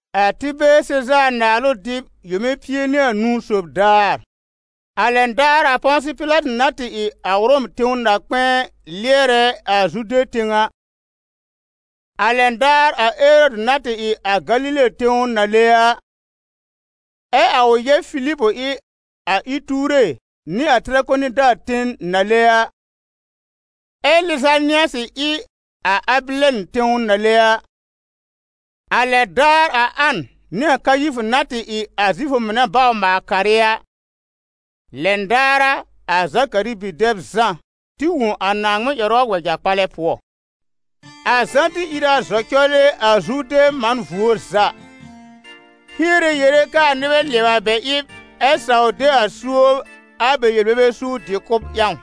A Tɩbɛɛr Sezaar naalʋ dɩb yome pie nɩ anũu sob daar, a lɛn daar a Pɔ̃sɩ-Pɩlatɩ na tɩ ɩ a Ʋrɔm tẽw na-kpɛ̃ɛ lɩɛrɛ a Zude tẽw a, a lɛn daar a Erɔdɩ na tɩ ɩ a Galile tẽw nàle a, ɛ a ʋ yɛb Filib ɩ a Ɩtuure nɩ a Tɩrakonida ten nàle a, ɛ Lɩzanɩasɩ ɩ a Abɩlɛn tẽw nàle a, a lɛn daar a An nɩ Kayifʋ na tɩ ɩ a Zifʋ mɩnɛ bawr-maal-karɩ a, lɛn daar a, a Zakari bi-dɛb Zã tɩ wõ a Naaŋmɩn ƴɛrʋ a wɛja-kpalɛ pʋɔ. A Zã tɩ ìr a zɔ cɔlɩ a Zurdɛ̃ man vuo za, hiere yere kɛ a nɩbɛ lɩɛbɩ a bɛ ɩb, ɛ saw de a suob a bɛ yel-bebe suur dɩ-kʋ̀b ƴãw;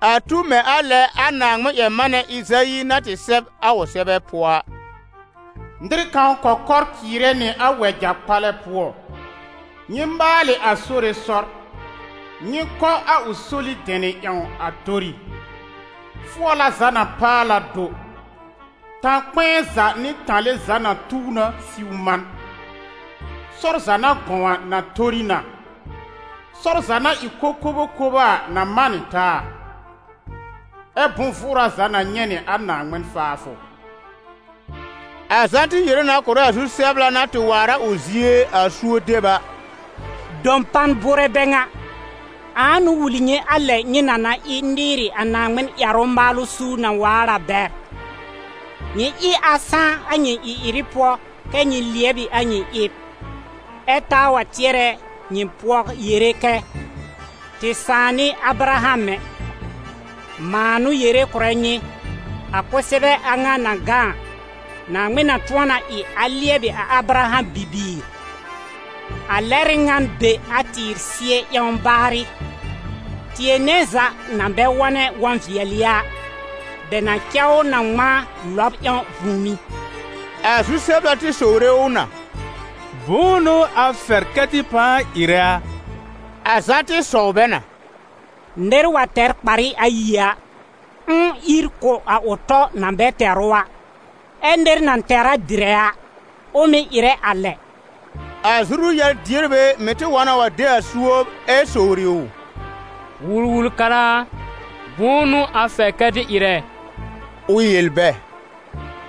a tu mɛ̃ a lɛ a Naaŋmɩn-ƴɛr-manɛ Ɩzayi na tɩ sɛb a ʋ sɛbɛ pʋɔ a: «Nɩr kãw kɔkɔr cɩɩrɛ nɩ a wɛja-kpalɛ pʋɔ: Nyɩ maalɩ a Sore sɔr, nyɩ kɔ a ʋ soli dɛnɩ ƴãw a tori. Fʋɔla za na paal a do, tã-kpɛ̃ɛ za nɩ tãle za na tuw na siw man, sɔr za na gɔ̃w a na tori na, sɔr za na ɩ kokobokobo a na man nɩ taa, ɛ bʋ̃-vʋʋra za na nyɛ̃ nɩ a Naaŋmɩn faafʋ.» A Zã tɩ yere na kʋ̀rɛ a zu-sɛbla na tɩ waar a ʋ zie a suob deb a: «Dɔpan bʋʋrɛ bɛ ŋa! Ãa n'ʋ wul nyɩ a lɛ nyɩ na na ɩ nɩɩrɩ a Naaŋmɩn ƴɛrʋ maalʋ suur na waar a bɛr? Nyɩ ɩ a sãá a nyɩ ɩ-ɩrɩ pʋɔ kɛ́ nyɩ lɩɛb ɩ a nyɩ ɩb, ɛ taa wa tɩɛrɛ nyɩ pʋɔ yere kɛ: ‹Tɩ sãà n'ɩ Abraham ɛ!› Mãa n'ʋ yere kʋ̀rɛ nyɩ, a kʋsɛbɛ a ŋa na gã a, Naaŋmɩn na tʋ̃ɔ na ɩ a lɩɛbɩ Abraham bibiir. A lɛr ɩ ŋan be a tɩɩr sɩɛ ƴãw baarɩ; tɩɛ nɛ za na bɛ wɔ̃nɛ wɔ̃-vɩɛlɩ a, bɛ na cɛ ʋ na ŋmãa lɔb ƴãw vũùmí.» A zu-sɛbla tɩ sowre ʋ na: «Bʋ̃ʋ n'ʋ a fɛr kɛ tɩ pãa ɩrɛ a?» A Zã tɩ sɔw bɛ na: «Nɩr wa tɛr kparɩ ayi a, ʋ̃ʋ ír kʋ̀ a ʋ tɔ na bɛ tɛr ʋ a, ɛ nɩr na tɛr a dɩrɛ a, ʋ mɩ̀ ɩrɛ a lɛ.» A zuru-yar-dierbɛ mɩ̀ tɩ wa na wa de a suob ɛ sowri ʋ: «Wul-wul-kara a, bʋ̃ʋ n'ʋ a fɛr kɛ tɩ ɩrɛ?» Ʋ yel bɛ: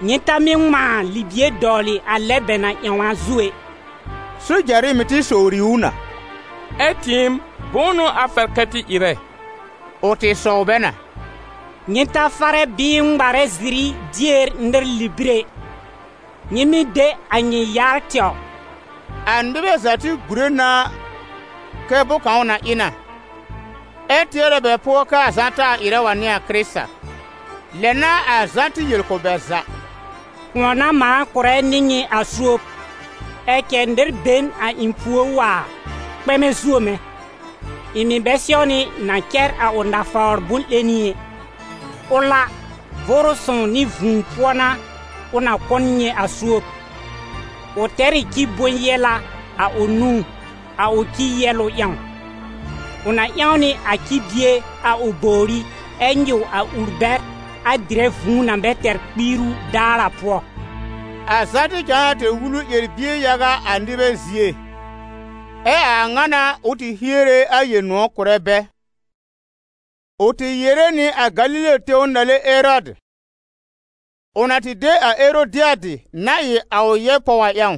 «Nyɩ ta mɩ́ ŋmãa libie dɔwlɩ a lɛ bɛ na ƴãw a zu ɛ.» Sojarɩ mɩ̀ tɩ sowri ʋ na: «Ɛ tɩɩm, bʋ̃ʋ n'ʋ a fɛr kɛ tɩ ɩrɛ?» Ʋ tɩ sɔw bɛ na: «Nyɩ ta farɛ bɩɩ ŋmarɛ ziri dier nɩr libir ɛ, nyɩ mɩ́ de a nyɩ yar tɛwr.» A nɩbɛ za tɩ gùre na kɛ bʋ̃-kãw na ɩ na, ɛ tɩɛrɛ bɛ pʋɔ kɛ a Zã taa ɩrɛ wa n'ɩ a Kɩrɩta. Lɛ n'a a Zã tɩ yel kʋ̀ bɛ za: «Kʋ̃ɔ n'a mãa kʋ̀rɛ nɩ nyɩ a suob, ɛ cɛ nɩr be n a ɩ̃ pùor waar, kpɛmɛ zuo mɛ̃, ɩ̃ mɩ̀ bɛ sɛwnɩ na cɛr a ʋ nafawr bʋ̃-'lẽni ɛ. Ʋl a, Vʋʋrʋ Sõw nɩ vũu pʋɔ n'a ʋ na kʋ̀ nyɩ a suob. Ʋ tɛr ɩ ci bʋ̃-yɛla a ʋ nũú, a ʋ ci yɛ́lʋ ƴãw; ʋ na ƴãw nɩ a ci-bie a ʋ bòwrí ɛ nyɩw a ur bɛr, a dɩrɛ vũu na bɛ tɛr kpiiru daar a pʋɔ.» A Zã tɩ cãa na tɛr wulu ƴɛr-bie yaga a nɩbɛ zie, ɛ a a ŋa n'a ʋ tɩ hiere a Yel-nʋ̃ɔ̀ kʋ̀rɛ bɛ. Ʋ tɩ yere nɩ a Galile tẽw nàle Erɔdɩ, ʋ na tɩ de a Erodɩadɩ na ɩ a ʋ yɛb pɔw a ƴãw,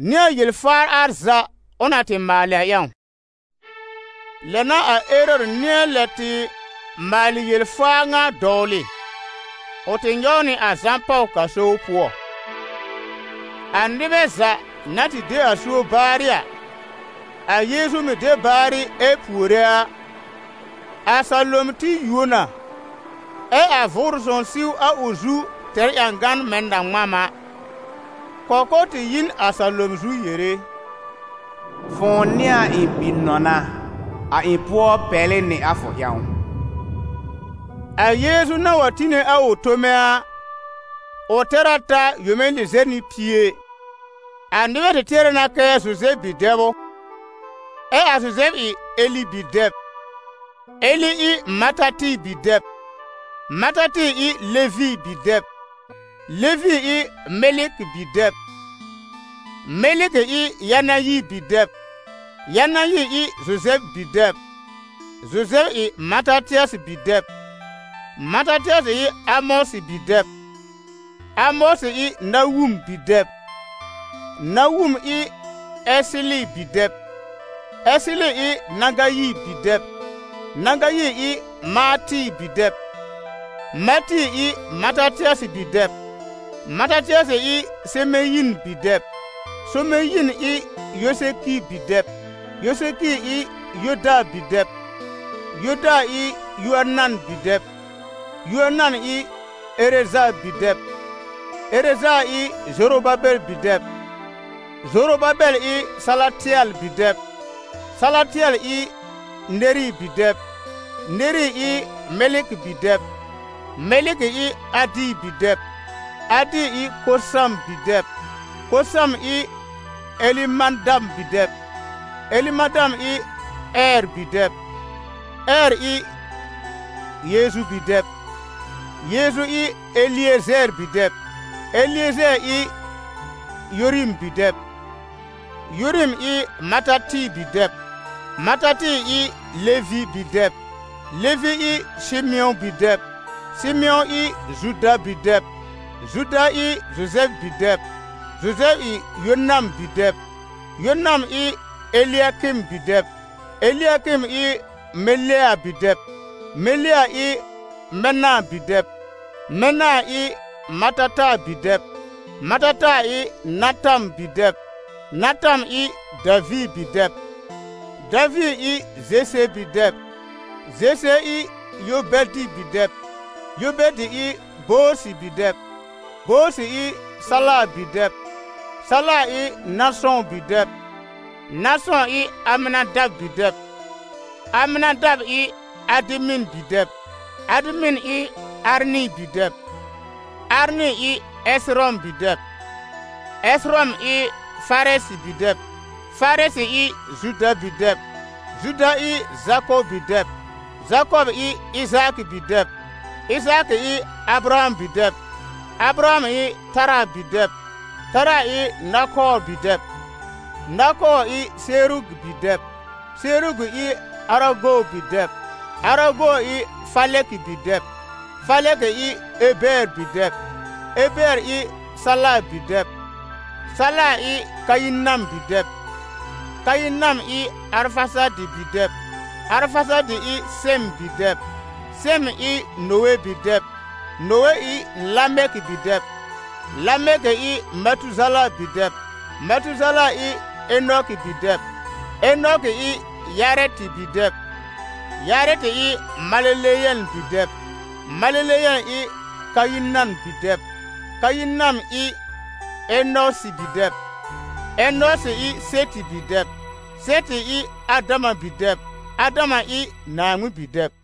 nɩ a yel-faar al za ʋ na tɩ maalɩ a ƴãw. Lɛ n'a a Erɔdɩ nɩ̃ɛ lɛb tɩ maalɩ yel-faa ŋa dɔwlɩ: ʋ tɩ nyɔw nɩ a Zã pàw gaso pʋɔ. A nɩbɛ za na tɩ de a suob baarɩ a, a Yeezu mɩ̀ de baarɩ ɛ puore a, a salom tɩ yuo na, ɛ a Vʋʋrʋ Sõw siw a ʋ zu tɛr ƴãgan mɛ̃ na-ŋmam a; kɔkɔr tɩ yi n a salom zu yere: «Fʋ̃ʋ n'ɩ a ɩ̃ Bi-nɔna, a ɩ̃ pʋɔ pɛlɩ nɩ a fʋ ƴãw.» A Yeezu na wa tɩ tine a ʋ tome a, ʋ tɛr a ta yome lɩzɛr nɩ pie. A nɩbɛ tɩ tɩɛrɛ na kɛ Zuzɛb bi-dɛb ʋ, ɛ a Zuzɛb ɩ Eli bi-dɛb, Eli ɩ Matatɩ bi-dɛb, Matatɩ ɩ Levi bi-dɛb, Levi ɩ Mɛlɩkɩ bi-dɛb, Mɛlɩkɩ ɩ Yanayi bi-dɛb, Yanayi ɩ Zuzɛb bi-dɛb, Zuzɛb ɩ Matatɩasɩ bi-dɛb, Matatɩasɩ ɩ Amɔsɩ bi-dɛb, Amɔsɩ ɩ Nawum bi-dɛb, Nawum ɩ Ɛsɩlɩ bi-dɛb; Ɛsɩlɩ ɩ Nagayi bi-dɛb, Nagayi ɩ Maatɩ bi-dɛb, Maatɩ ɩ Matatɩasɩ bi-dɛb, Matatɩasɩ ɩ Semeyin bi-dɛb, Semeyin ɩ Yosekɩ bi-dɛb, Yosekɩ ɩ Yoda bi-dɛb; Yoda ɩ Yoanan bi-dɛb, Yoanan ɩ Ereza bi-dɛb, Ereza ɩ Zorobabɛl bi-dɛb, Zorobabɛl ɩ Salatɩɛl bi-dɛb, Salatɩɛl ɩ Neri bi-dɛb, Neri ɩ Mɛlɩkɩ bi-dɛb, Mɛlɩkɩ ɩ Adi bi-dɛb, Adi ɩ Kosam bi-dɛb, Kosam ɩ Ɛlɩmadam bi-dɛb, Ɛlɩmadam ɩ Ɛɛr bi-dɛb, Ɛɛr ɩ Yeezu bi-dɛb, Yeezu ɩ Eliezɛɛr bi-dɛb, Eliezɛɛr ɩ Yorim bi-dɛb, Yorim ɩ Matatɩ bi-dɛb, Matatɩ ɩ Levi bi-dɛb, Levi ɩ Sɩmɩ̃ɔ bi-dɛb, Sɩmɩ̃ɔ ɩ Zuda bi-dɛb, Zuda ɩ Zuzɛb bi-dɛb, Zuzɛb ɩ Yonam bi-dɛb, Yonam ɩ Elɩakɩm bi-dɛb, Elɩakɩm ɩ Melea bi-dɛb, Melea ɩ Mɛna bi-dɛb, Mɛna ɩ Matata bi-dɛb, Matata ɩ Natam bi-dɛb, Natam ɩ Daviir bi-dɛb, Daviir ɩ Zese bi-dɛb, Zese ɩ Yobɛdɩ bi-dɛb, Yobɛdɩ ɩ Boozɩ bi-dɛb, Boozɩ ɩ Sala bi-dɛb, Sala ɩ Nasɔ̃ bi-dɛb, Nasɔ̃ ɩ Amɩnadab bi-dɛb, Amɩnadab ɩ Adɩmɩn bi-dɛb, Adɩmɩn ɩ Arnɩ bi-dɛb, Arnɩ ɩ Ɛsɩrɔm bi-dɛb, Ɛsɩrɔm ɩ Farɛsɩ bi-dɛb, Farɛsɩ ɩ Zuda bi-dɛb, Zuda ɩ Zakɔb bi-dɛb, Zakɔb ɩ Ɩzaakɩ bi-dɛb, Ɩzaakɩ ɩ Abraham bi-dɛb, Abraham ɩ Tara bi-dɛb, Tara ɩ Nakoor bi-dɛb, Nakoor ɩ Serugi bi-dɛb, Serugi ɩ Arago bi-dɛb, Arago ɩ Falɛkɩ bi-dɛb, Falɛkɩ ɩ Ebɛɛr bi-dɛb, Ebɛɛr ɩ Sala bi-dɛb, Sala ɩ Kayinam bi-dɛb, Kayinam ɩ Arfasadɩ bi-dɛb, Arfasadɩ ɩ Sɛm bi-dɛb, Sɛm ɩ Nowe bi-dɛb, Nowe ɩ Lamɛkɩ bi-dɛb, Lamɛkɩ ɩ Matuzala bi-dɛb, Matuzala ɩ Enɔkɩ bi-dɛb, Enɔkɩ ɩ Yarɛtɩ bi-dɛb, Yarɛtɩ ɩ Maleleyɛl bi-dɛb, Maleleyɛl ɩ Kayinam bi-dɛb, Kayinam ɩ Enɔsɩ bi-dɛb, Enɔsɩ ɩ Sɛtɩ bi-dɛb, Sɛtɩ ɩ Adama bi-dɛb, Adama ɩ Naaŋmɩn bi-dɛb.